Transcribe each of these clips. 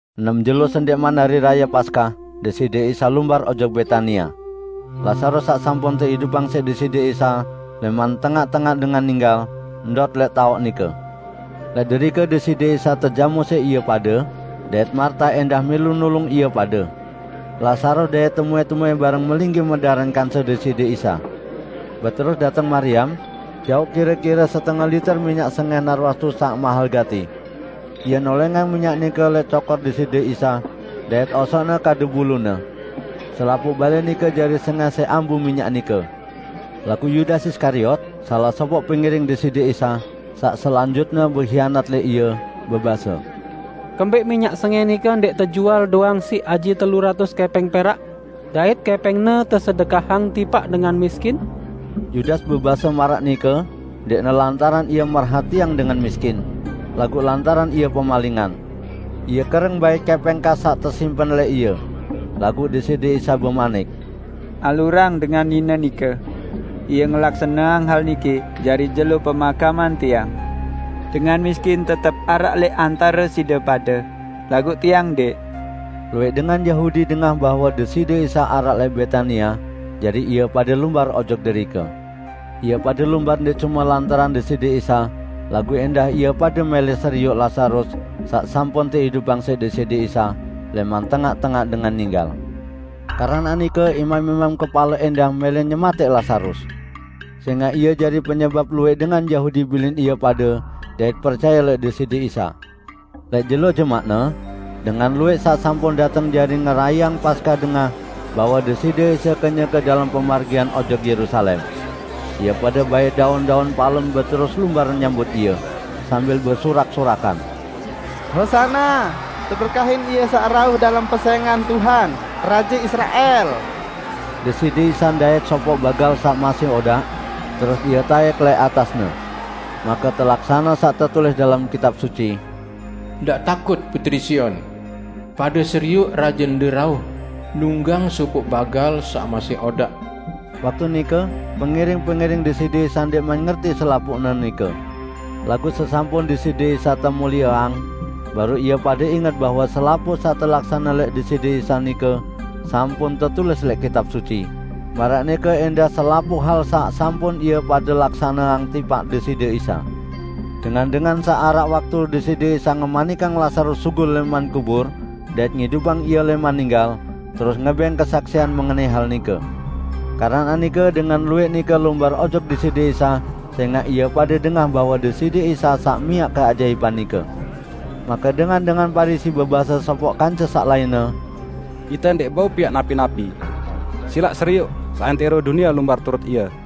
Enem jelo sendẽqman Hari Raye Paskah, Deside Isa lumbar ojok Betania. Lazarus saq sampun teidupang siq Deside Isa lẽman tengaq-tengaq dengan ninggal, ndot lẽq taoq nike. Lẽq derike Deside Isa tejamu siq ie pade dait Marta ẽndah milu nulung ie pade. Lazarus dait temuẽ-temuẽ bareng melinggih medaran kance Deside Isa. Beterus dateng Mariam, jauq kire-kire setenge liter minyak sengẽh narwastu saq mahel gati. Ie nolẽngang minyak nike lẽq cokor Deside Isa, dait osokne kadu bulune. Selapuq balẽ nike jari sengẽh siq ambu minyak nike. Laguq Yudas Iskariot, salaq sopoq pengiring Deside Isa -- saq selanjutne behianat lẽq Ie -- bebase, "Kembẽq minyak sengẽh nike ndẽq tejual doang siq aji telu ratus kẽpẽng perak, dait kẽpẽngne tesedekahang tipaq dengan miskin?" Yudas bebase maraq nike ndẽqne lantaran ie merhatiang dengan miskin, laguq lantaran ie pemalingan. Ie kereng bait kẽpẽng kas saq tesimpen lẽq ie. Laguq Deside Isa bemanik, "Alurang dengan nine nike! Ie ngelaksaneang hal niki jari jelo pemakaman Tiang. Dengan miskin tetep araq lẽq antare side pade, laguq Tiang ndẽq." Luwẽq dengan Yahudi dengah bahwe Deside Isa araq lẽq Betania, jari ie pade lumbar ojok derike. Ie pade lumbar ndẽq cume lantaran Deside Isa, laguq ẽndah ie pade mẽlẽ serioq Lazarus saq sampun teidupang siq Deside Isa lẽman tengaq-tengaq dengan ninggal. Keranaq nike imam-imam kepale ẽndah mẽlẽ nyematẽq Lazarus; sẽngaq ie jari penyebap luwẽq dengan Yahudi bilin ie pade dait percaye lẽq Deside Isa. Lẽq jelo jemaqne, dengan luwẽq saq sampun dateng jari ngerayeang Paskah dengah bahwe Deside Isa kenyeke dalem pemargian ojok Yerusalem. Ie pade bait daun-daun palem beterus lumbar nyambut Ie, sambil besurak-surakan, "Hosana! Teberkahin Ie saq rauh dalem pesẽngan Tuhan, Raje Israel!" Deside Isa ndait sopoq bagal saq masih odaq, terus Ie taẽk lẽq atasne. Make telaksane saq tetulis dalem Kitab Suci: "Ndaq takut, putri Sion! Pade serioq Rajende rauh, nunggang sopoq bagal saq masih odaq!" Waktu nike pengiring-pengiring Deside Isa ndẽqman ngerti selapuqne nike. Laguq sesampun Deside Isa temulieang, baruq ie pade inget bahwe selapuq saq telaksane lẽq Deside Isa nike sampun tetulis lẽq Kitab Suci, maraq nike ẽndah selapuq hal saq sampun ie pade laksaneang tipaq Deside Isa. Dengan-dengan saq araq waktu Deside Isa ngemanikang Lazarus sugul lẽman kubur dait ngidupang ie lẽman ninggal, terus ngebẽng kesaksian mengenai hal nike. Keranaq nike dengan luwẽq nike lumbar ojok Deside Isa sẽngaq ie pade dengah bahwe Deside Isa saq miaq keajaipan nike. Make dengan-dengan Parisi bebase sopoq kance saq lainne, "Ite ndẽq bau piaq napi-napi! Silaq serioq, seantẽro dunie lumbar turut Ie!"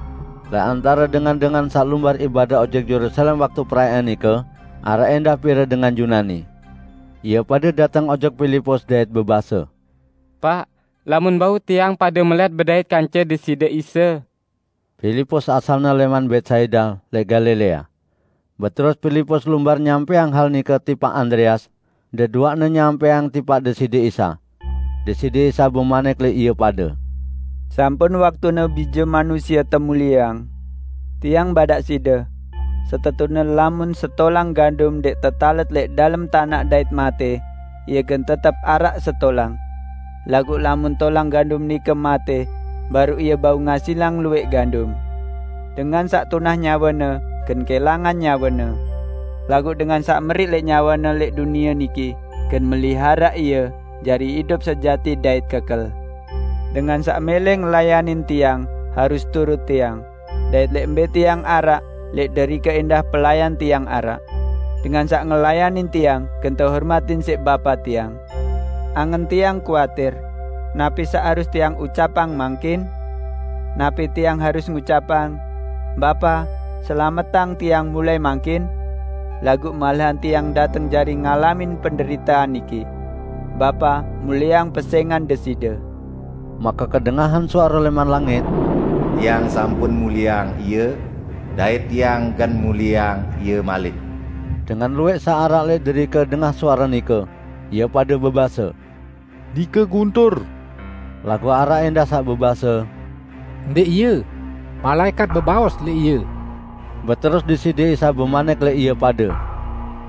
Lẽq antare dengan-dengan saq lumbar ibadah ojok Yerusalem waktu perayaan nike araq ẽndah pire dengan Yunani. Ie pade dateng ojok Pilipus dait bebase, "Paq, lamun bau tiang pade melẽt bedait kance Deside Isa." (Pilipus asalne lẽman Betsaida lẽq Galilea.) Beterus Pilipus lumbar nyampẽang hal nike tipaq Andreas, deduaqne nyampẽang tipaq Deside Isa. Deside Isa bemanik lẽq ie pade, "Sampun waktune Bije Manusie temulieang. Tiang badaq side: Setetune lamun setolang gandum ndẽq tetalet lẽq dalem tanaq dait matẽ, ie gen tetep araq setolang. Laguq lamun tolang gandum nike matẽ, baruq ie bau ngasilang luwẽq gandum. Dengan saq tunah nyawene gen kẽlangan nyawene. Laguq dengan saq meriq lẽq nyawene lẽq dunie niki, gen meliharaq ie jari idup sejati dait kekel. Dengan saq mẽlẽ ngelayanin Tiang harus turut Tiang, dait lẽq mbẽ Tiang araq lẽq derike ẽndah pelayan Tiang araq. Dengan saq ngelayanin Tiang gen tehormatin siq Bapa Tiang." "Angen Tiang kuatir; napi saq harus Tiang ucapang mangkin? Napi Tiang harus ngucapang, 'Bapa, selametang Tiang mulai mangkin?' Laguq malahan Tiang dateng jari ngalamin penderitean niki. Bapa, mulieang pesẽngan Deside!" Make kedengahan suare lẽman langit, "Tiang sampun mulieang Ie, dait Tiang gen mulieang Ie malik." Dengan luwẽq saq araq lẽq derike dengah suare nike. Ie pade bebase, "Nike guntur!" Laguq araq ẽndah saq bebase, "Ndẽq ie! Malaẽkat bebaos lẽq Ie!" Beterus Deside Isa bemanik lẽq ie pade,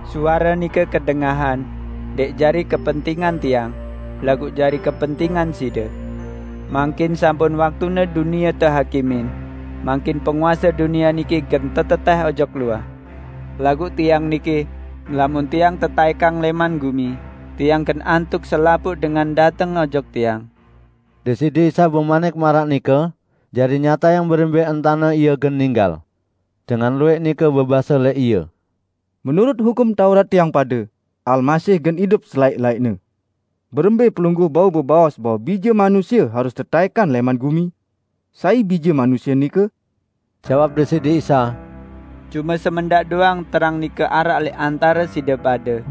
"Suare nike kedengahan, ndẽq jari kepentingan Tiang, laguq jari kepentingan side. Mangkin sampun waktune dunie tehakimin; mangkin penguase dunie niki gen tetetẽh ojok luah. Laguq Tiang niki, lamun Tiang tetaẽkang lẽman gumi, Tiang gen antuq selapuq dengan dateng ojok Tiang." Deside Isa bemanik maraq nike jari nyatayang berembẽ entane Ie gen ninggal. Dengan luwẽq nike bebase lẽq Ie, "Menurut Hukum Taurat tiang pade, Almasih gen idup selaẽq-laẽqne. Berembẽ Pelungguh bau bebaos bahwe Bije Manusie harus tetaẽkang lẽman gumi? Sai Bije Manusie nike?" Jawab Deside Isa, "Cume semendaq doang terang nike araq lẽq antare side pade.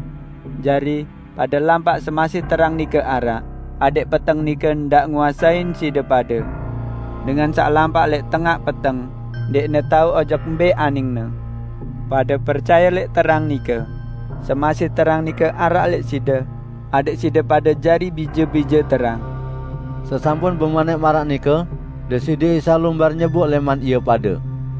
Jari, pade lampaq semasih terang nike araq, adẽq peteng nike ndaq nguasein side pade. Dengan saq lampaq lẽq tengaq peteng ndẽqne taoq ojok mbẽ aningne. Pade percaye lẽq terang nike, semasih terang nike araq lẽq side, adẽq side pade jari bije-bije terang." Sesampun bemanik maraq nike, Deside Isa lumbar nyeboq lẽman ie pade.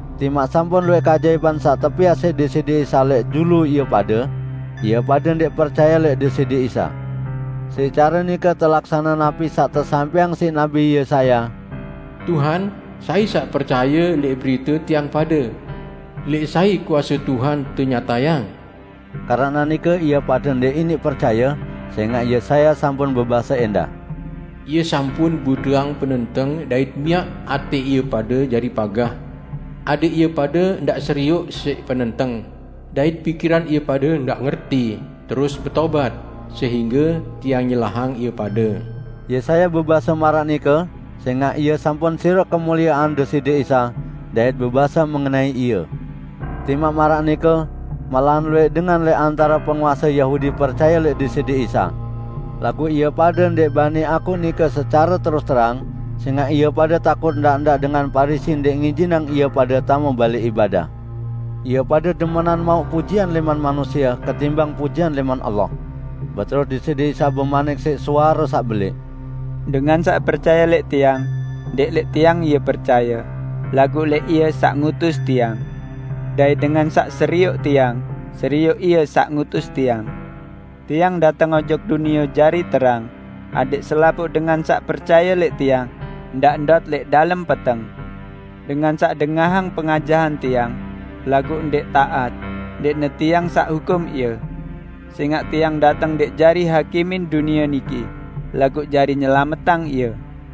Timaq sampun luwẽq keajaipan saq tepiaq siq Deside Isa lẽq julu ie pade, ie pade ndẽq percaye lẽq Deside Isa. Siq care nike telaksane napi saq tesampẽang siq nabi Yesaya, "Tuhan, sai saq percaye lẽq berite tiang pade? Lẽq sai kuase Tuhan tenyatayang?" Keranaq nike ie pade ndẽq iniq percaye, sẽngaq Yesaya sampun bebase ẽndah, "Ie sampun buteang penenteng dait miaq atẽ ie pade jari pagah; adẽq ie pade ndaq serioq siq penenteng, dait pikiran ie pade ngerti, terus betobat, sehingge Tiang nyelahang ie pade." Yesaya bebase maraq nike sẽngaq ie sampun serioq kemuliean Deside Isa, dait bebase mengenai Ie. Timaq maraq nike, malahan luwẽq dengan lẽq antare penguase Yahudi percaye lẽq Deside Isa. Laguq ie pade ndẽq bani akuq nike secare terus terang, sẽngaq ie pade takut ndaq-ndaq dengan Parisi ndẽq ngijinang ie pade tame balẽ ibadah. Ie pade demenan mauq pujian lẽman manusie ketimbang pujian lẽman Allah. Beterus Deside Isa bemanik siq suare saq belẽq, "Dengan saq percaye lẽq Tiang, ndẽq lẽq Tiang ie percaye, laguq lẽq Ie saq ngutus Tiang. Dait dengan saq serioq Tiang, serioq Ie saq ngutus Tiang. Tiang dateng ojok dunie jari terang, adẽq selapuq dengan saq percaye lẽq Tiang ndaq ndot lẽq dalem peteng. Dengan saq dengahang pengajahan Tiang, laguq ndẽq taat -- ndẽqne Tiang saq hukum ie. Sẽngaq Tiang dateng ndẽq jari hakimin dunie niki, laguq jari nyelametang ie.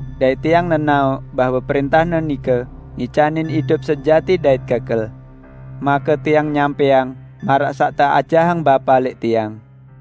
Dait Tiang nenaoq bahwe prẽntah-Ne nike ngicanin idup sejati dait kekel. Make Tiang nyampẽang maraq saq teajahang Bapa lẽq Tiang."